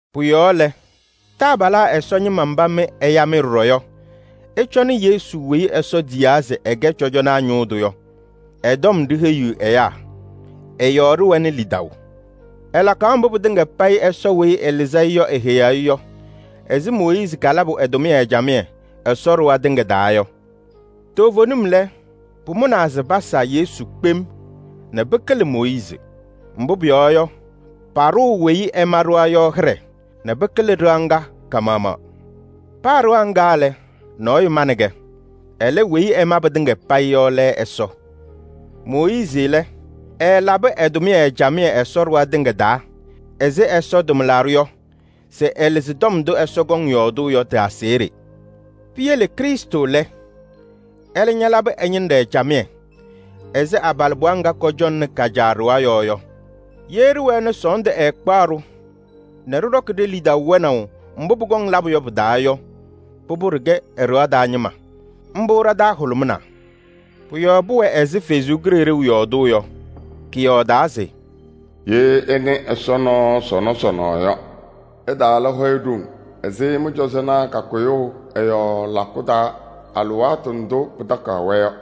Pʋ-yɔɔ lɛ, taabalaa Ɛsɔ ñɩma mba mɩ ɛya-mɩ ɖɔɖɔ yɔ, ɩcɔnɩ Yesu weyi Ɛsɔ tiyaa se ɛkɛ cɔjɔnaa ñʋʋ tʋ yɔ. Ɛ-tɔm ɖiheyiɣ ɛyaa, ɛ-yɔɔ ɖɩwɛnɩ lidaʋ. Ɛlakaɣ mbʋ pɩtɩŋa payɩ Ɛsɔ weyi ɛlɩzɩ-ɩ yɔ eheyaɣ-i yɔ ɛzɩ Mooyiizi kalabʋ ɛ-tʋmɩyɛ camɩyɛ Ɛsɔ ɖɩɣa tɩŋa taa yɔ. Toovenim lɛ, pʋmʋnaa se pasa Yesu kpem nɛ pɩkɩlɩ Mooyiizi. Mbʋ pʋyɔɔ yɔ, paɖʋʋ weyi ɛma ɖɩɣa yɔ hɩɖɛ nɛ pɩkɩlɩ ɖɩɣa ŋga ka-maɣmaɣ. Paa ɖɩɣa ŋga lɛ, nɔɔyʋ manɩ-kɛ. Ɛlɛ, weyi ɛma pɩtɩŋa payɩ yɔ lɛ Ɛsɔ. Mooyiizi lɛ, ɛɛlabɩ ɛ-tʋmɩyɛ camɩyɛ Ɛsɔ ɖɩɣa tɩŋa taa ɛzɩ Ɛsɔ tʋmlaɖʋ yɔ se ɛlɩzɩ tɔm ndʋ Ɛsɔ kɔŋ yɔɔdʋʋ yɔ tɩ-aseɣɖe. Piyele Krɩstʋ lɛ, ɛlɛ ñalabɩ ɛ-ñɩnɖɛ camɩyɛ ɛzɩ abalɩbɩɣa ŋga kɔcɔŋnɩ ka-caa ɖɩɣa yɔɔ yɔ. Ye ɖɩwɛɛ nɛ sɔɔndʋ ɛɛkpaɣ-ɖʋ nɛ ɖɩɖɔkɩ ɖe-lidaʋ wɛnaʋ mbʋ pʋkɔŋ labʋ yɔ pɩ-taa yɔ, pʋbʋ, ɖɩkɛ ɛ-ɖɩɣa taa ñɩma. Mbʋ ɖa-taa hʋlʋmɩnaa. Pʋ-yɔɔ pʋwɛ ɛzɩ Ɛsɔ Kalɩzaɣ yɔɔdʋʋ yɔ. Kɔyɔɔdaa se: “Ye ɩnɩ Ɛsɔ nɔɔ sɔnɔ sɔnɔ yɔ, ɩtaala hɔyɛ ɖoŋ ɛzɩ mɩ-cɔzɔnaa kakʋyʋʋ ɛ-yɔɔ lakʋ taa alɩwaatʋ ndʋ pɩtakaɣ-wɛ yɔ.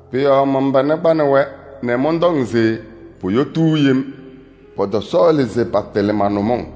Pʋ-yɔɔ man-pana kpanɩ-wɛ nɛ mɔntɔŋ se poyotuu yem, patatɩlɩ ma-nʋmɔŋ.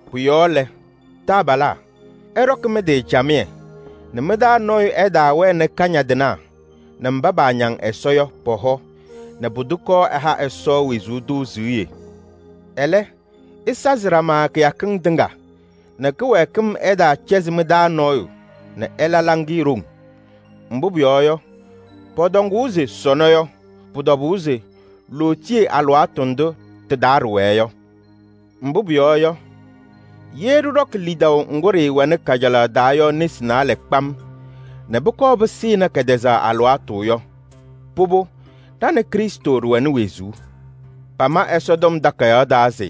Pʋ-yɔɔ lɛ, taabalaa! Ɩɖɔkɩ mɩ-tɩ camɩyɛ nɛ mɩ-taa nɔɔyʋ ɛtaawɛnɩ kañadɩnaa nɛ mba paañaŋ Ɛsɔ yɔ pɔ-hɔ nɛ pʋdʋ kɔɔ ɛha Ɛsɔ wezuu tʋ siɣye! Ɛlɛ, ɩsazɩ ɖama kɩyakɩŋ tɩŋa nɛ kɩwɛɛkɩm ɛtaacɛzɩ mɩ-taa nɔɔyʋ nɛ ɛla hɔyɛ ɖoŋ. Mbʋ pʋyɔɔ yɔ, pɔtɔŋʋʋ se: “Sɔnɔ” yɔ, pʋ-tɔbʋʋ se lootiye alɩwaatʋ ndʋ tɩ-taa ɖɩwɛɛ yɔ. Mbʋ pʋyɔɔ yɔ, ye ɖɩɖɔkɩ lidaʋ ŋgʋ ɖɩɩwɛnɩ kajalaɣ taa yɔ nesi naalɛ kpam nɛ pʋkɔɔ pɩsɩnɩ kɛtɛzaɣ alɩwaatʋ yɔ, pʋbʋ, ɖa nɛ Krɩstʋ ɖɩwɛnɩ wezuu. Pama Ɛsɔtɔm Takayaɣ taa se: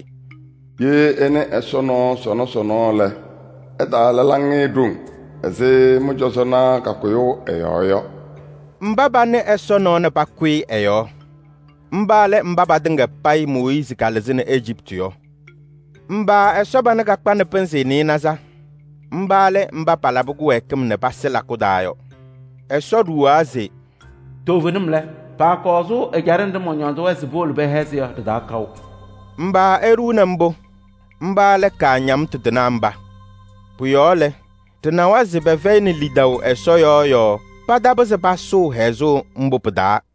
“Ye ɩnɩ Ɛsɔ nɔɔ sɔnɔ sɔnɔ lɛ, ɩtaala hɔyɛ ɖoŋ ɛzɩ mɩ-cɔzɔnaa kakʋyʋʋ ɛ-yɔɔ yɔ.” Mba panɩ Ɛsɔ nɔɔ nɛ pakʋyɩ ɛ-yɔɔ? Mba lɛ mba patɩŋa payɩ Mooyiizi kalɩzɩnɩ Ejiptɩ yɔ. Mba Ɛsɔ pana kakpanɩ pɩnzɩ nɩɩnaza? Mba lɛ mba palabɩ kɩwɛɛkɩm nɛ pasɩ lakʋ taa yɔ. Ɛsɔ ɖuwaa se: “Toovenim lɛ, paakɔŋ sʋʋ ɛjaɖɛ nɖɩ mɔñɔɔzɩ-wɛ se powolo pɛhɛzɩ yɔ ɖɩ-taa kaʋ.” Mba eɖuuni mbʋ? Mba lɛ kaañamtʋ tɩnaa mba. Pʋ-yɔɔ lɛ, ɖɩnawa se pɛfɛyɩnɩ lidaʋ Ɛsɔ yɔɔ yɔɔ patapɩzɩ pasʋʋ hɛzʋʋ mbʋ pɩ-taa.